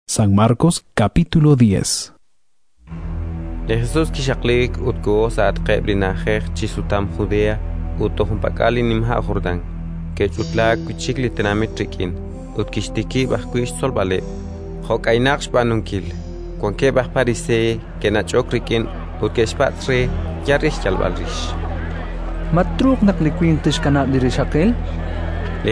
Ink'a' naru te'xjach rib' li sumsuukeb' Li Jesus kixaqliik ut koho sa'atqeb' li na'ajej chi xsutam Judea ut toj junpak'al li nima' Jordán. Ke'ch'utlaak wi' chik li tenamit rik'in, ut kixtikib' ajwi' xtzolb'aleb', jo' k'aynaq xb'aanunkil. Wankeb' aj Pariseey ke'nach'ok rik'in ut ke'xpatz' re, yal re xyalb'al rix: —Ma truuq naq li winq tixkanab' li rixaqil? chankeb' re.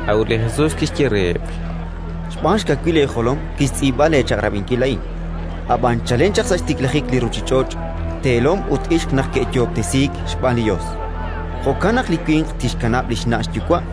A'ut li Jesus kixye reheb': —Xb'aan xkawil eejolom kixtz'iib'a leechaq'rab'inkil a'in. Ab'an chalen chaq sa' xtiklajik li ruuchich'och' «teelom ut ixq naq ke'yoob'tesiik xb'aan li Yos». Jo'kan naq li winq tixkanab' li xna' xyuwa',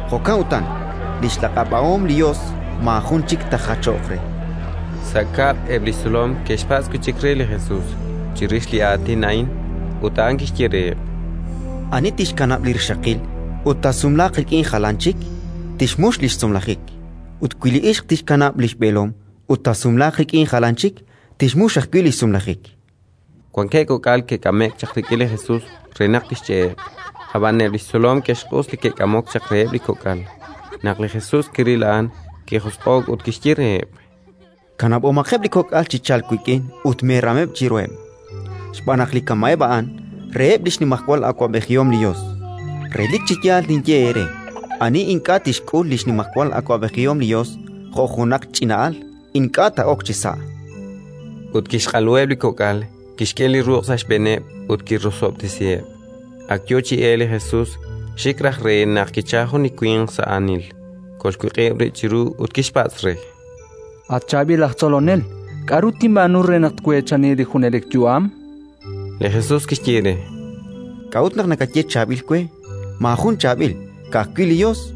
Jo'kan utan, li xlaq'ab'ahom li Yos, maajun chik taajachoq re. Sa' kab'l eb' li xtzolom ke'xpatz' wi' chik re li Jesus chirix li aatin a'in. Ut a'an kixye reheb': —Ani tixkanab' li rixaqil ut taasumlaaq rik'in jalan chik, tixmux li xsumlajik; ut wi li ixq tixkanab' li xb'eelom ut taasumlaaq rik'in jalan chik, tixmux ajwi' li xsumlajik. Wankeb' kok'al ke'k'ame'k chaq rik'in li Jesus re naq tixch'e'eb'; ab'an eb' li xtzolom ke'xq'us li ke'k'amok chaq reheb' li kok'al. Naq li Jesus kiril a'an, kijosq'o'k ut kixye reheb': —Kanab'omaqeb' li kok'al chi chalk wik'in ut meeram chiruheb', xb'aan naq li kama'eb' a'an, reheb' li xnimajwal awab'ejihom li Yos. Relik chi yaal ninye eere: ani ink'a' tixk'ul li xnimajwal awab'ejihom li Yos jo' junaq ch'ina'al, ink'a' taa'ok chisa'. Ut kixq'aluheb' li kok'al, kixk'e li ruq' sa' xb'eeneb' ut kirosob'tesiheb'. Ak yo chi elk li Jesus, xik raj re, naq kichalk jun li winq sa' aanil, kolxwiq'ib' rib' chiru ut kixpatz' re: —At chaab'il aj Tzolonel, k'aru tinb'aanu re naq tweechani li junelik yu'am? Li Jesus kixye re: —K'a'ut naq nakaye chaab'il we? Maajun chaab'il, ka'ajwi' li Yos.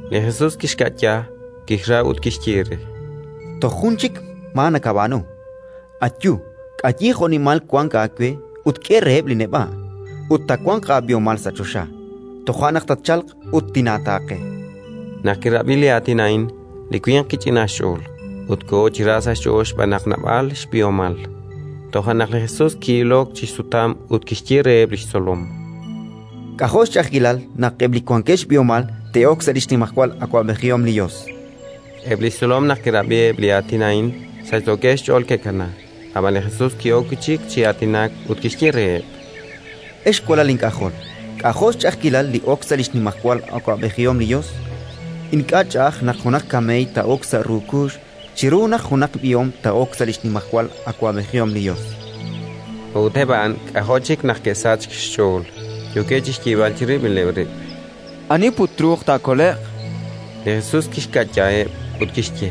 Li Jesus kixka'ya, kixra ut kixye re: —Toj jun chik maa nakab'aanu: ayu, k'ayi jo'nimal wank aawe ut k'e reheb' li neb'a', ut taawanq aab'ihomal sa' choxa; toja' naq tatchalq ut tinaataaqe. Naq kirab'i li aatin a'in, li winq kich'inaak xch'ool, ut koho chi ra sa' xch'ool xb'aan naq naab'al xb'ihomal. Toja' naq li Jesus ki'ilok chi xsutam ut kixye reheb' li xtzolom: —K'ajo' xch'a'ajkilal naq eb' li wankeb' xb'ihomal te'ok sa' li xnimajwal awab'ejihom li Yos! Eb' li xtzolom naq ke'rab'i eb' li aatin a'in, sachsookeb' xch'ool ke'kanaak. Ab'an li Jesus ki'ok wi' chik chi aatinak ut kixye reheb': —Ex walal ink'ajol, k'ajo' xch'a'ajkil li ok sa' li xnimajwal awab'ejihom li Yos! Ink'a' ch'a'aj naq junaq kameey taa'ok sa' ru kuux chiru naq junaq b'ihom taa'ok sa' li xnimajwal awab'ejihom li Yos. A'ut eb' a'an k'ajo' chik naq ke'sachk xch'ool, yookeb' chi xyeeb'al chirib'ileb' rib': —Ani put truuq taakole'q? Li Jesus kixka'yaheb' ut kixye: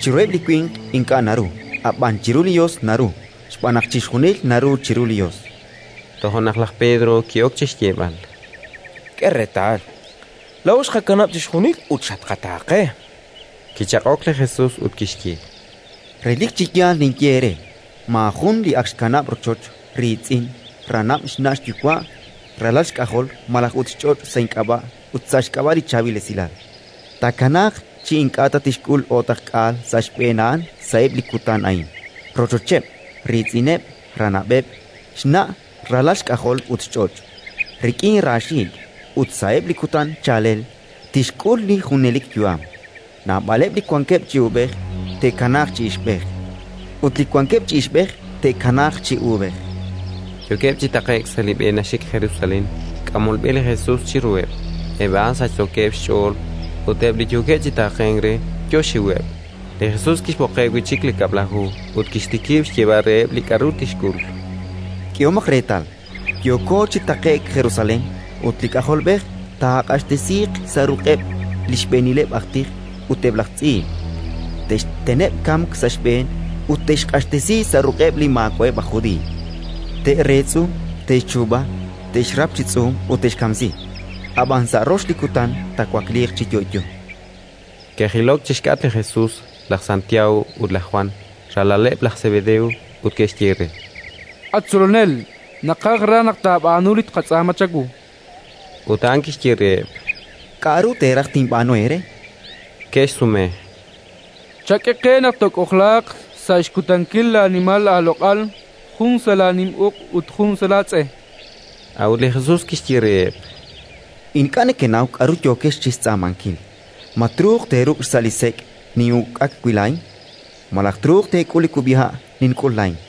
—Chiruheb' li winq ink'a' naru, ab'an chiru li Yos naru, xb'aan naq chixjunil naru chiru li Yos. Toja' naq laj Pedro ki'ok chi xyeeb'al: —K'e reetal, laa'o xqakanab' chixjunil ut xatqataaqe. Kichaq'ok li Jesus ut kixye: —Relik chi yaal ninye eere: maajun li ak xkanab' rochoch, riitz'in, ranab', xna' xyuwa', ralal xk'ajol malaj ut xch'och' sa' ink'ab'a' ut sa' xk'ab'a' li Chaab'il Esilal, taakanaaq chi ink'a' ta tixk'ul o'taqk'aal sa' xb'een a'an sa'eb' li kutan a'in (rochocheb', riitz'ineb', ranab'eb', xna', ralal xk'ajol ut xch'och', rik'in raaxiik'), ut, sa'eb' li kutan chaalel, tixk'ul li junelik yu'am. Naab'aleb' li wankeb' chi uub'ej, te'kanaaq chi ixb'ej; ut li wankeb' chi ixb'ej, te'kanaaq chi uub'ej. Yookeb' chi taqe'k, sa' li b'e naxik Jerusalén, k'amol b'e li Jesus chiruheb'; eb' a'an sachsookeb' xch'ool ut eb' li yookeb' chi taaqenk re yo xxiweb'. Li Jesus kixb'oqeb' wi' chik li Kab'laju ut kixtikib' xyeeb'al reheb' li k'aru tixk'ul: “K'ehomaq reetal, yooko chi taqe'k Jerusalén, ut li K'ajolb'ej taaq'axtesiiq sa' ruq'eb' li xb'eenileb' aj tij ut eb' laj tz'iib'. Te'xteneb' kamk sa' xb'een ut te'xq'axtesi sa' ruq'eb' li maawa'eb' aj Judiiy. Te'reetz'u, te'xchuub'a, te'xrap chi tz'uum ut te'xkamsi; ab'an sa' rox li kutan taawakliiq chi yo'yo”. Ke'jilok chi xk'atq li Jesus laj Santiago ut laj Jwan, ralaleb' laj Sebedeo, ut ke'xye re: —At Tzolonel, naqaj raj naq taab'aanu li tqatz'aama chawu. Ut a'an kixye reheb': —K'aru teeraj tinb'aanu eere? Ke'xsume: —Chak'e qe naq took'ojlaaq, sa' xkutankil laanimal laaloq'al, jun sa' laanim uq' ut jun sa' laatz'e, chankeb'. A'ut li Jesus kixye reheb': —Ink'a' nekenaw k'aru yookex chi xtz'aamankil. Ma truuq teeruk' xsa' li sek' nin'uk'ak wi' laa'in, malaj truuq teek'ul li kub'iha' nink'ul laa'in?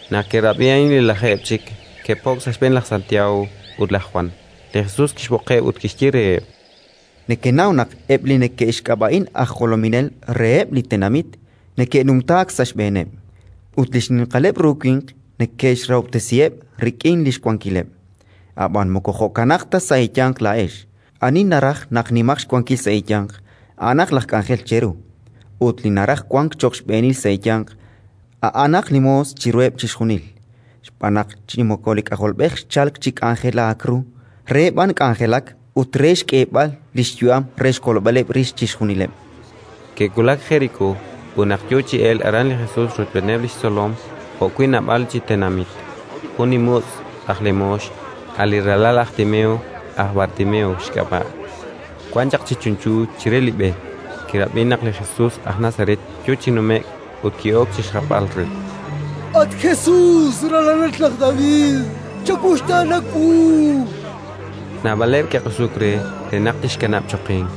Naq ke'rab'i a'in li lajeeb' chik, ke'po'k sa' xb'een laj Santiago ut laj Jwan. Li Jesus kixb'oqeb' ut kixye reheb': —Nekenaw naq eb' li neke'xk'ab'a'in aj jolominel reheb' li tenamit neke'numtaak sa' xb'eeneb', ut li xninqaleb' ru winq neke'xrahob'tesiheb' rik'in li xwankileb'. Ab'an moko jo'kanaq ta sa' eeyanq laa'ex: ani naraj naq nimaq xwankil sa' eeyanq, a'anaq laj k'anjel cheru, ut li naraj wank cho'q xb'eenil sa' eeyanq, a'anaq li moos chiruheb' chixjunil. Xb'aan naq chi moko li K'ajolb'ej xchalk chi k'anjelaak ru, re b'an k'anjelak ut re xk'eeb'al li xyu'am re xkolb'aleb' rix chixjunileb'. Ke'wulak Jerikó ut, naq yo chi elk aran li Jesus rochb'eeneb' li xtzolom jo'wi' naab'al chi tenamit, jun li mutz' aj lemoox, a' li ralal laj Timeo (aj Bartimeo xk'ab'a'), wan chaq chi chunchu, chire li b'e. Kirab'i naq a' li Jesus aj Nazaret yo chi nume'k, ut ki'ok chi xjapb'al re: —At Jesus, ralalat laj David, chawuxtaana wu. Naab'aleb' ke'q'usuk re, re naq tixkanab' choqink;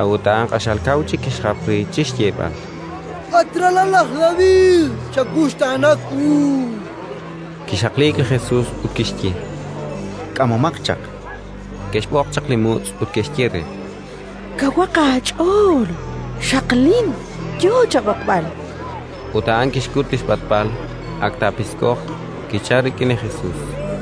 a'ut a'an q'axal kaw chik kixjap re chi xyeeb'al: —At ralal laj David, chawuxtaana wu. Kixaqliik li Jesus ut kixye: —B'oqomaq chaq. Ke'xb'oq chaq li mutz' ut ke'xye re: —Kawaq aach'ool. Xaqlin, yo chab'oqb'al. Ut a'an kixkut li xb'atb'al, ak taapisk'oq, kichalk rik'in li Jesus.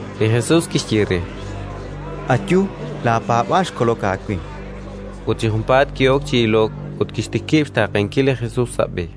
Li Jesus kixye re: —Ayu, laapaab'aal xkolok aawe. Ut chi junpaat ki'ok chi ilok ut kixtikib' xtaaqenkil li Jesus sa' b'e.